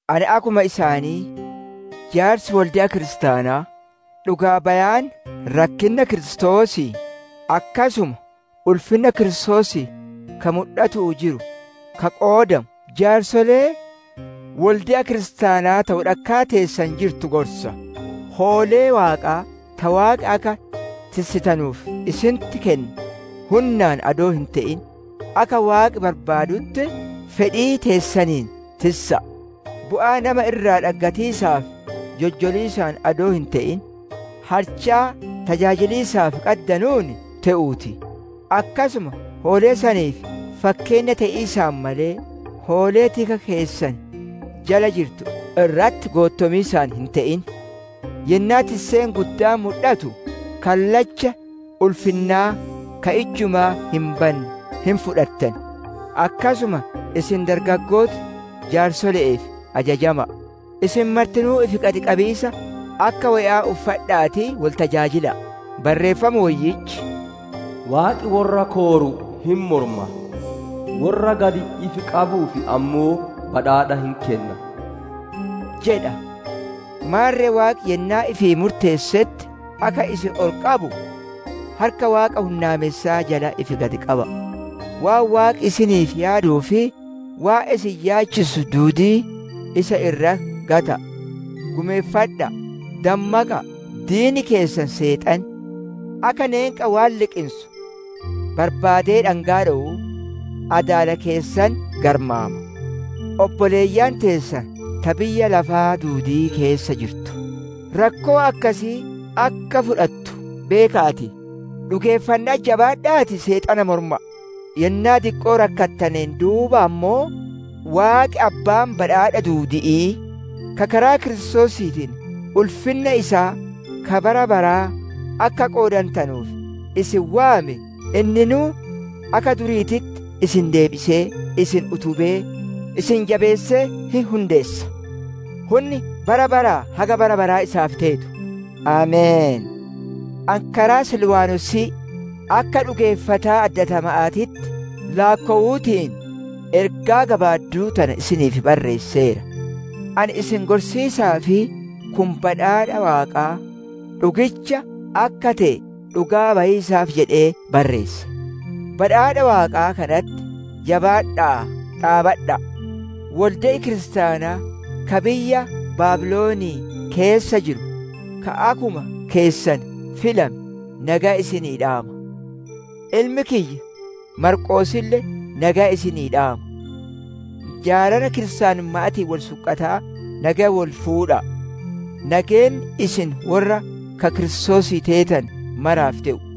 Ani akkuma isaanii jaarsi wolde'a Kiristaanaa, dhugaa bayaan rakkinna Kiristoosii, akkasuma ulfinna Kiristoosii ka mudhatu'uu jiru ka qoodamu, jaarsolee wolde'a kiristaanaa ta wodhakkaa teessan jirtu gorsa. Hoolee Waaqaa ta Waaqi akka tissitanuuf isinitti kenne hunnaan adoo hin te'in akka Waaqi barbaadutti, fedhii teessaniin tissa'a; bu'aa nama irraa dhaggatiisaaf joljoliisaan adoo hin te'in, halchaa tajaajiliisaaf qaddanuun te'uu ti. Akkasuma hoolee saniif fakkeenna te'iisaan malee, hoolee tika keessan jala jirtu irratti goottomiisaan hin te'in. Yennaa tisseen guddaan mudhatu, kallacha ulfinnaa ka ijjumaa hin banne hin fudhattan. Akkasuma isin dargaggooti jaarsole'eef ajajama'a. Isin martinuu ifi gad qabiisa akka woya'aa uffadha'aatii wol tajaajila'a. Barreeffam Woyyichi, «Waaqi worra kooru hin morma; worra gad ifi qabuuf ammoo badhaadha hin kenna» jedha. Maarre Waaqi yennaa ifii murteessetti akka isin ol qabu, harka Waaqa hunnaamessaa jalatti ifi gad qaba'a. Waan Waaqi isiniif yaaduuf, waan isin yaachisu duudii isa irratti gata'a. Gumeeffadha'a; dammaqa'a! Diinni keessan Seexanni, akka neenqa waan liqinsu barbaadee dhangaa dhowuu, adaala keessan garmaama. Obboleeyyan teessan ta biyya lafaa duudii keessa jirtu, rakkoo akkasii akka fudhatu beeka'aatii, dhugeeffanna'atti jabaadha'aatii Seexana morma'a. Yennaa diqqoo rakkattaneen duuba ammoo, Waaqi abbaan badhaadha duudi'ii, ka karaa Kiristoosiitiin ulfinna isaa ka bara baraa akka qoodantanuuf isin waame, inninuu akka duriititti isin deebisee, isin utubee, isin jabeessee hin hundeessa. Hunni bara baraa haga bara baraa isaaf teetu! Ameen. Ani karaa Silwaanosii akka dhugeeffataa addatama'aatitti laakkowuutiin ergaa gabaadduu tana isiniif barreesseera; ani isin gorsiisaa fi kun badhaadha Waaqaa dhugicha akka te'e dhugaa bayiisaaf jedhee barreesse. Badhaadha Waaqaa kanatti jabaadha'aa dhaabbadha'a. Wolde'i kiristaanaa ka biyya Baabilonii keessa jiru, ka akkuma keessan filame nageya isinii dhaama; ilmi kiyya Maarqoosille nageya isinii dhaama. Jaalala kiristaanumma'aatiin wol sunqataa nageya wol fuudha'a. Nageenni isin worra ka Kiristoosii teetane maraaf te'u.